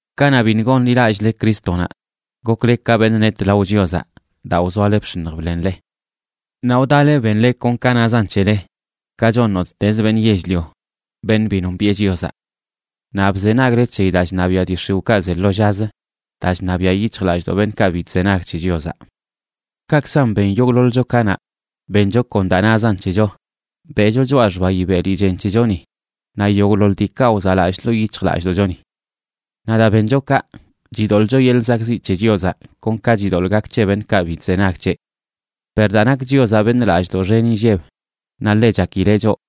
Kanaꞌ biṉꞌ gonḻilallꞌle Crístonaꞌ, gokle ka beṉꞌ net lao Chiozaꞌ daa wzoale bx̱iṉj bḻenle. Naꞌ wdale benle kon ka nazan c̱hele, ka chon nottezə beṉꞌ yell-lio, beṉꞌ bi nombiꞌe Chiozaꞌ. Naꞌ bzenagle c̱heyi daa chṉabiaꞌ dii x̱iwꞌkaꞌ ze lo llazə, daa chṉabiaꞌ yic̱hjlallꞌdoꞌ beṉꞌkaꞌ bi chzenag c̱he Chiozaꞌ. Kaꞌkzan ben yogꞌḻoḻcho kanaꞌ, bencho kon daa nazan c̱hecho, beꞌcho choꞌa xbayi beli chen c̱hechoni naꞌ yogꞌḻoḻ diikaꞌ wzaꞌlallꞌ ḻoo yic̱hjlallꞌdoꞌchoni. Naꞌ daa bencho kaꞌ, chidoḻꞌcho yeḻꞌ zakꞌziꞌ c̱he Chiozaꞌ kon ka chidoḻꞌ gak c̱he beṉꞌkaꞌ bi chzenag c̱heꞌ. Per daa nak Chiozaꞌ beṉꞌ lallꞌdoꞌ xen inlleb naꞌ ḻe chakileꞌ choꞌ,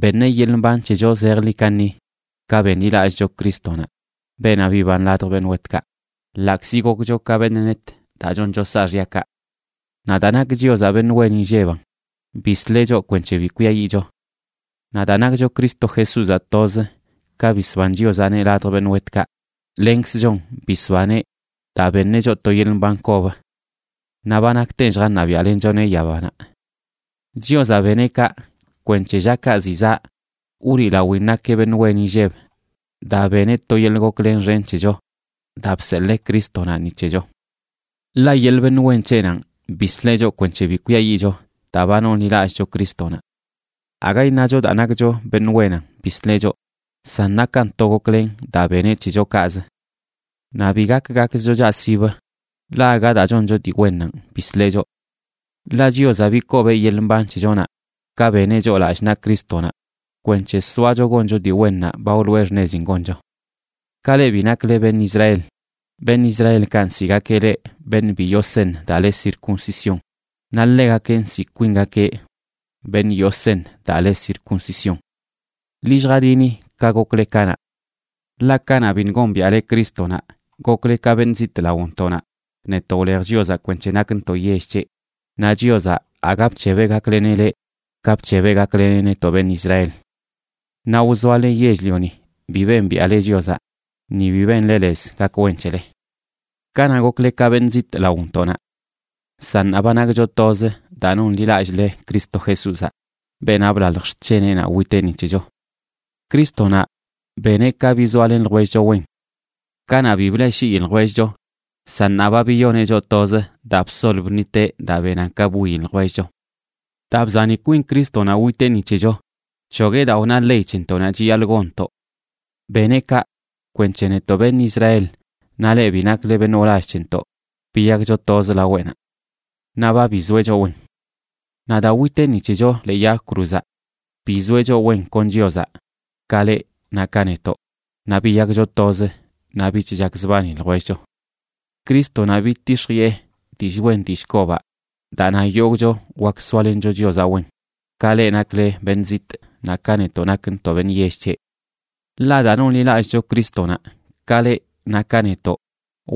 beṉeꞌ yeḻꞌ mban c̱hecho zejḻi kaṉi ka benḻilallꞌcho Crístonaꞌ, beenaꞌ biban ladj beṉꞌ wetkaꞌ, ḻaꞌkzi gokcho ka beṉꞌ net daa choncho saaxyakaꞌ. Naꞌ daa nak Chiozaꞌ beṉꞌ wen inlleban, bisleꞌ choꞌ kwenc̱he bi kwiayiꞌcho. Naꞌ daa nakcho Cristo Jesúzaꞌ toz, ka bisban Chiozaꞌneꞌ ladj beṉꞌ wetkaꞌ, lenkzchon bisbaneꞌ daa beṉeꞌ choꞌ to yeḻꞌ mban kob. Naꞌ ba nakten lljaṉabiaꞌlenchoneꞌ yabanaꞌ. Chiozaꞌ beneꞌ kaꞌ kwenc̱he llakaꞌ ziꞌ zaꞌ wliꞌlawin nakeꞌ beṉꞌ wen inlleb daa beneꞌ to yeḻꞌ goklen xen c̱hecho daa bseḻee Crístonaꞌ ni c̱hecho. Ḻaꞌ yeḻꞌ beṉꞌ wen c̱heꞌnanꞌ bisleꞌ choꞌ kwenc̱he bi kwiayiꞌcho daa ba nonḻilallcho Crístonaꞌ. Aga iṉacho daa nakcho beṉꞌ wenan bisleꞌ choꞌ, san nakan to goklen daa beneꞌ c̱hecho kaꞌzə. Naꞌ bi gak gakzcho chaꞌsib, ḻaꞌ aga daa choncho dii wennanꞌ bisleꞌ choꞌ. Ḻaꞌ Chiozaꞌ bikobeꞌ yeḻꞌ mban c̱hechonaꞌ ka beneꞌ choꞌ lallꞌ naꞌ Crístonaꞌ kwenc̱he soacho goncho dii wennaꞌ ba wloꞌe xṉezin goncho. Ka leꞌ bi nakle beṉꞌ Israel, beṉꞌ Israelkaꞌ nsiꞌgakeꞌ leꞌ Beṉꞌ bi yoo seṉ daa le circuncisión, naꞌ ḻegakeꞌ nsiꞌ kwingakeꞌ Beṉꞌ yoo seṉ daa le circuncisión. Ḻi lljadini ka gokle kanaꞌ. Ḻaꞌ kanaꞌ biṉꞌ gombiaꞌle Crístonaꞌ, gokle ka beṉꞌ zitꞌ laontoꞌnaꞌ, netoꞌ wlej Chiozaꞌ kwenc̱he nakntoꞌ yell c̱heꞌ, naꞌ Chiozaꞌ aga bc̱hebeꞌ gakleneꞌ leꞌ ka bc̱hebeꞌ gakleneꞌ netoꞌ beṉꞌ Israel. Naꞌ wzoale yell-lioni bi bembiaꞌle Chiozaꞌ ni bi benle lez gak wen c̱hele. Kanaꞌ, gokle ka beṉꞌ zitꞌ laontoꞌnaꞌ. San ṉaa, ba nakcho toz daa nonḻilallꞌle Cristo Jesúzaꞌ, beenaꞌ blalj xc̱heneꞌnaꞌ witeꞌ ni c̱hecho. Crístonaꞌ beneꞌ ka bizoalen ljwellcho wen. Kanaꞌ, bi bleꞌshii ljwellcho, san ṉaa, ba biyoneꞌ choꞌ toz daa bsol bṉiteꞌ daa benan ka bwiyi ljwellcho. Daa bzani kwin Crístonaꞌ witeꞌ ni c̱hecho, bc̱hogueꞌ daa wna ley c̱hentoꞌnaꞌ chiyaḻꞌ gonntoꞌ. Beneꞌ kaꞌ kwenc̱he netoꞌ beṉꞌ Israel naꞌ leꞌ bi nakle beṉꞌ wlall c̱hentoꞌ biyakcho toz laweꞌnaꞌ. Naꞌ ba bizoeꞌ choꞌ wen. Naꞌ daa witeꞌ ni c̱hecho ḻee yag cruzaꞌ, bizoeꞌ choꞌ wen kon Chiozaꞌ, ka leꞌ naꞌ ka netoꞌ, naꞌ biyakcho toz naꞌ bich chakzbani ljwellcho. Crístonaꞌ bidtix̱jiꞌe dillꞌ wen dillꞌ kobaꞌ daa na yogꞌcho wak soalencho Chiozaꞌ wen, ka leꞌ nakle beṉꞌ zitꞌ naꞌ ka netoꞌ nakntoꞌ beṉꞌ yell c̱heꞌ. Ḻaꞌ daa nonḻilallꞌcho Crístonaꞌ, ka leꞌ naꞌ ka netoꞌ,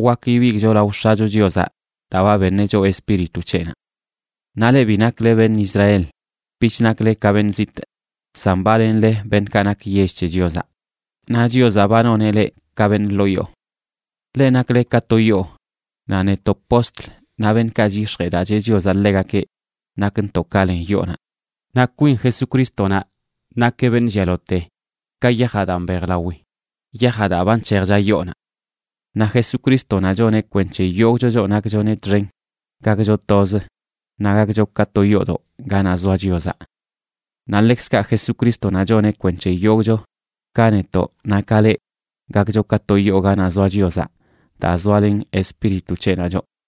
wak ibigꞌcho lao X̱acho Chiozaꞌ daa ba beṉeꞌ choꞌ Espíritu c̱heꞌnaꞌ. Naꞌ leꞌ bi nakle beṉꞌ Israel bich nakle ka beṉꞌ zitꞌ, san ba lenle beṉꞌkaꞌ nak yell c̱he Chiozaꞌ, naꞌ Chiozaꞌ ba noneꞌ leꞌ ka beṉꞌ ḻoo yoo. Leꞌ nakle ka to yoo, naꞌ netoꞌ postl naꞌ beṉꞌkaꞌ chyix̱jee daa cheꞌ Chiozaꞌ ḻegakeꞌ nakntoꞌ ka len yoonaꞌ, naꞌ kwin Jesucrístonaꞌ nakeꞌ beṉꞌ llialaote ka yajaꞌ daa mbejlawi, yajaꞌ daa ba nc̱hejcha yoonaꞌ. Naꞌ Jesucrístonaꞌ choneꞌ kwenc̱he yogꞌcho choꞌ nakchoneꞌ txen gakcho toz naꞌ gakcho ka to yoodoꞌ ganaꞌ zoa Chiozaꞌ. Naꞌ ḻekzkaꞌ Jesucrístonaꞌ choneꞌ kwenc̱he yogꞌcho, ka netoꞌ naꞌ ka leꞌ, gakcho ka to yoo ganaꞌ zoa Chiozaꞌ daa zoalen Espíritu c̱heꞌnaꞌ choꞌ.